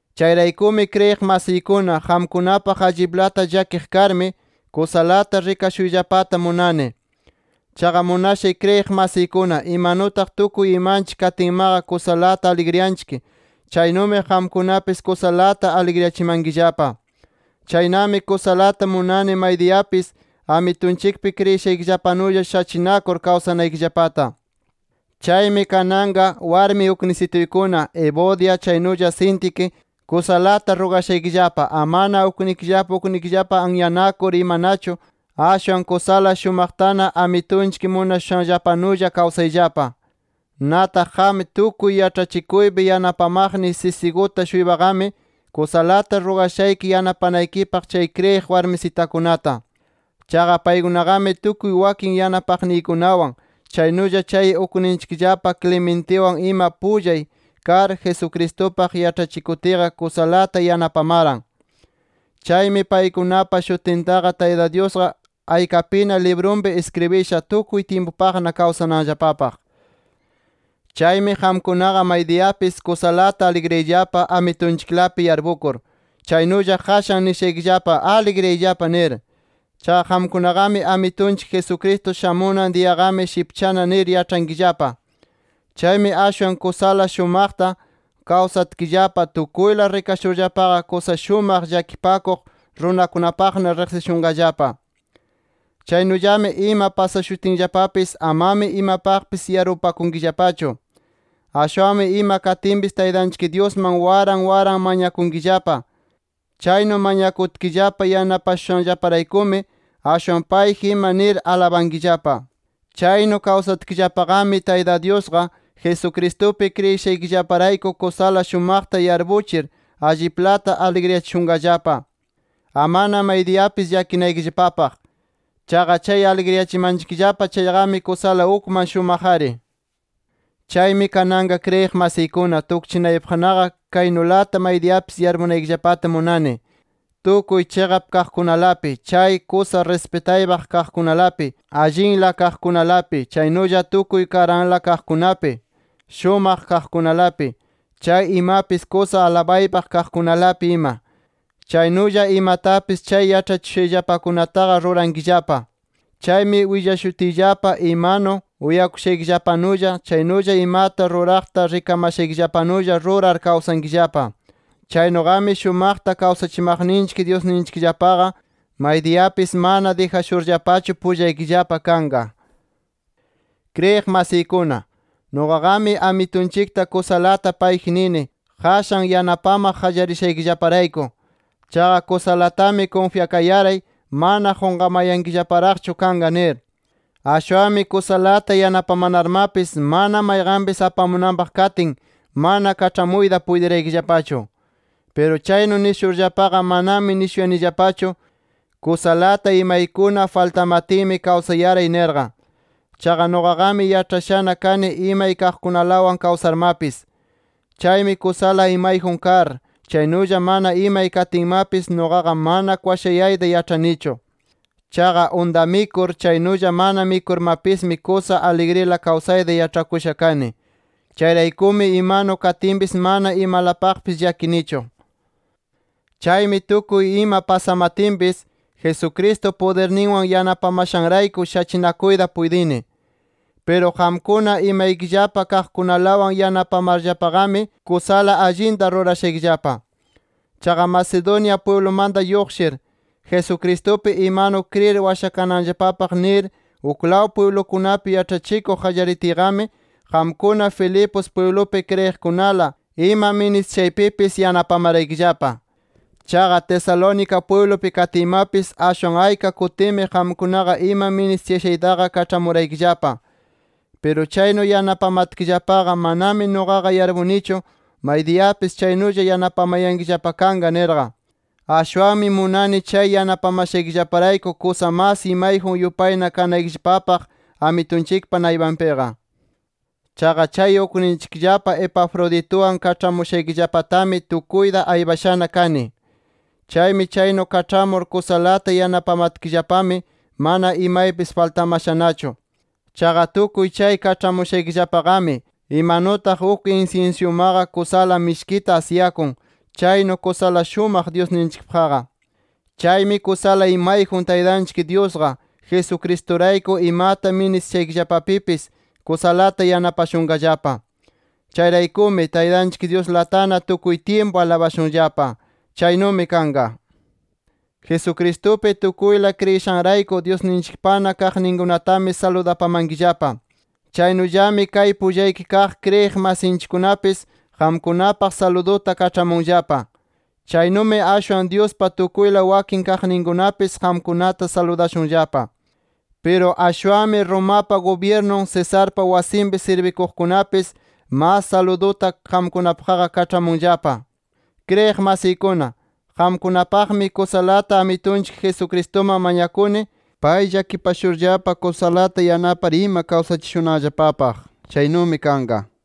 Chayraykumi kriyiq masiykuna, qamkunapaq alliplata llakiq karmi kusalata rikashuyllapata munani. Chaqa munashay kriyiq masiykuna imanutaq tukuy imanchik katinmaqa kusalata aligriyanchik, chaynumi qamkunapis kusalata aligriyachimankillapa. Chaynami kusalata munani maydiyapis Amitunchikpi kriyishaykillapanulla shachinakur kawsanaykillapata. Chaymi kananqa warmi uknisituykuna Evodia chaynulla Síntique, kusalata rugashaykillapa amana uknikillapa uknikillapa anyanakur imanachu, ashwan kusala shumaqtana Amitunchik munashushanllapanulla kawsayllapa. Nataq qam tukuy yaĉhachikuypi yanapamaqniy Siziguta-shuypaqami kusalata rugashayki yanapanaykipaq chay kriyiq warmisitakunata. Chaqa paykunaqami, tukuy wakin yanapaqniykunawan, chaynulla chay ukninchikllapa Clementiwan ima pullay kar Jesucristupaq yaĉhachikutiyqa, kusalata yanapamaran. Chaymi paykunapa shutintaqa Tayta Dyusqa aykapina librunpi iskribisha, tukuy tyimpupaqna kawsananllapapaq. Chaymi qamkunaqa maydiyapis kusalata aligriyayllapa Amitunchiklapi yarpukur. Chaynulla qashan nishaykillapa: ¡Aligriyayllapa! nir. Chaqa qamkunaqami Amitunchik Jesucristo shamunan diyaqami shipchana nir yaĉhankillapa. Chaymi ashwan kusala shumaqta kawsatkillapa, tukuyla rikashurllapaqa kusa shumaq llakipakuq runakunapaqna riqsishunqallapa. Chaynullami ima pasashutinllapapis amami imapaqpis yarpupakunkillapachu. Ashwanmi ima katinpis Taytanchik Dyusman waran waran mañakunkillapa. Chaynu mañakutkillapa yanapashushanllaparaykumi, ashwan payji ima nir alabankillapa. Chaynu kawsatkillapaqami Tayta Dyusqa, Jesucristupi kriyishaykillaparayku kusala shumaqta yarpuchir alliplata aligriyachishunllapa, amana maydiyapis llakinaykillapapaq. Chaqa chay aligriyachimanchikllapa chayqami kusala ukman shumaq-ari. Chaymi kananqa kriyiq masiykuna tukchinaypaqnaqa kaynulata maydiyapis yarpunaykillapata munani: Tukuy chiqap kaqkunalapi, chay kusa rispitaypaq kaqkunalapi, allinla kaqkunalapi, chaynulla tukuy karanla kaqkunapi, shumaq kaqkunalapi, chay imapis kusa alabaypaq kaqkunalapi ima. Chaynulla imatapis chay yaĉhachishushayllapakunataqa rurankillapa. Chaymi willashutiyllapa imanu uyakushaykillapanulla, chaynulla imata ruraqta rikamashaykillapanulla rurar kawsankillapa. Chaynuqami shumaqta kawsachimaqninchik Dyusninchikllapaqa maydiyapis mana dijashurllapachu, pullaykillapa kanqa. Kriyiq masiykuna, nuqaqami Amitunchikta kusalata payji nini qashan yanapamaq qallarishaykillaparayku. Chaqa kusalatami kunfyakayaray, mana qunqamayankillaparaqchu kanqa nir. Ashwanmi kusalata yanapamanarmapis, mana mayqanpis apamunanpaq katin, mana kaĉhamuyta puytiraykillapachu. Piru chaynu nishurllapaqa manami nishuyanillapachu, kusalata imaykuna faltamatinmi kawsayaray nirqa. Chaqa nuqaqami yaĉhashana kani imay kaqkunalawan kawsarmapis. Chaymi kusala imayjun kar, chaynulla mana imay katinmapis nuqaqa mana kwashayayta yaĉhanichu. Chaqa unta mikur, chaynulla mana mikurmapismi kusa aligrila kawsayta yaĉhakusha kani. Chayraykumi imanu katinpis mana imalapaqpis llakinichu. Chaymi tukuy ima pasamatinpis, Jesucristo pudirninwan yanapamashanrayku, shachinakuyta puytini. Piru qamkuna, imaykillapa kaqkunalawan yanapamarllapaqami, kusala allinta rurashaykillapa. Chaqa Macedonia pwiblumanta lluqshir, Jesucristupi imanu kriyir washakananllapapaq nir uklaw pwiblukunapi yaĉhachikuq qallaritiyqami, qamkuna Filipos pwiblupi kriyiqkunala, ima ministishaypipis yanapamaraykillapa. Chaqa Tesalónica pwiblupi katiymapis, ashwan ayka kutimi qamkunaqa ima ministiyashaytaqa kaĉhamuraykillapa. Piru chaynu yanapamatkillapaqa, manami nuqaqa yarpunichu maydiyapis chaynulla yanapamayankillapa kanqa nirqa. Ashwanmi munani chay yanapamashaykillaparayku kusa mas imayjun yupayna kanaykillapapaq Amitunchikpa naypanpiqa. Chaqa chay ukninchikllapa Epafrodituwan kaĉhamushaykillapatami tukuyta aypashana kani. Chaymi chaynu kaĉhamur kusalata yanapamatkillapami, mana imapis faltamashanachu. Chaqa tukuy chay kaĉhamushaykillapaqami, imanutaq uk insinsyumaqa kusala mishkita asyakun, chaynu kusala shumaq Dyusninchikpaqqa. Chaymi kusala imayjun Taytanchik Dyusqa, Jesucristurayku imata ministishaykillapapipis kusalata yanapashunqallapa. Chayraykumi, ¡Taytanchik Dyuslatana tukuy tyimpu alabashunllapa! ¡Chaynumi kanqa! Jesucristupi tukuyla kriyishanrayku Dyusninchikpana kaqninkunatami saludapamankillapa. Chaynullami kay pullaypi kaq kriyiq masinchikkunapis, qamkunapaq saluduta kaĉhamunllapa. Chaynumi ashwan Dyuspa tukuyla wakin kaqninkunapis qamkunata saludashunllapa. Piru ashwanmi Romapa gubyirnun Cesarpa wasinpi sirbikuqkunapis mas saluduta qamkunapaqqa kaĉhamunllapa. Kriyiq masiykuna, qamkunapaqmi kusalata Amitunchik Jesucristuman mañakuni, pay llakipashurllapa kusalata yanapar ima kawsachishunanllapapaq. Chaynumi kanqa.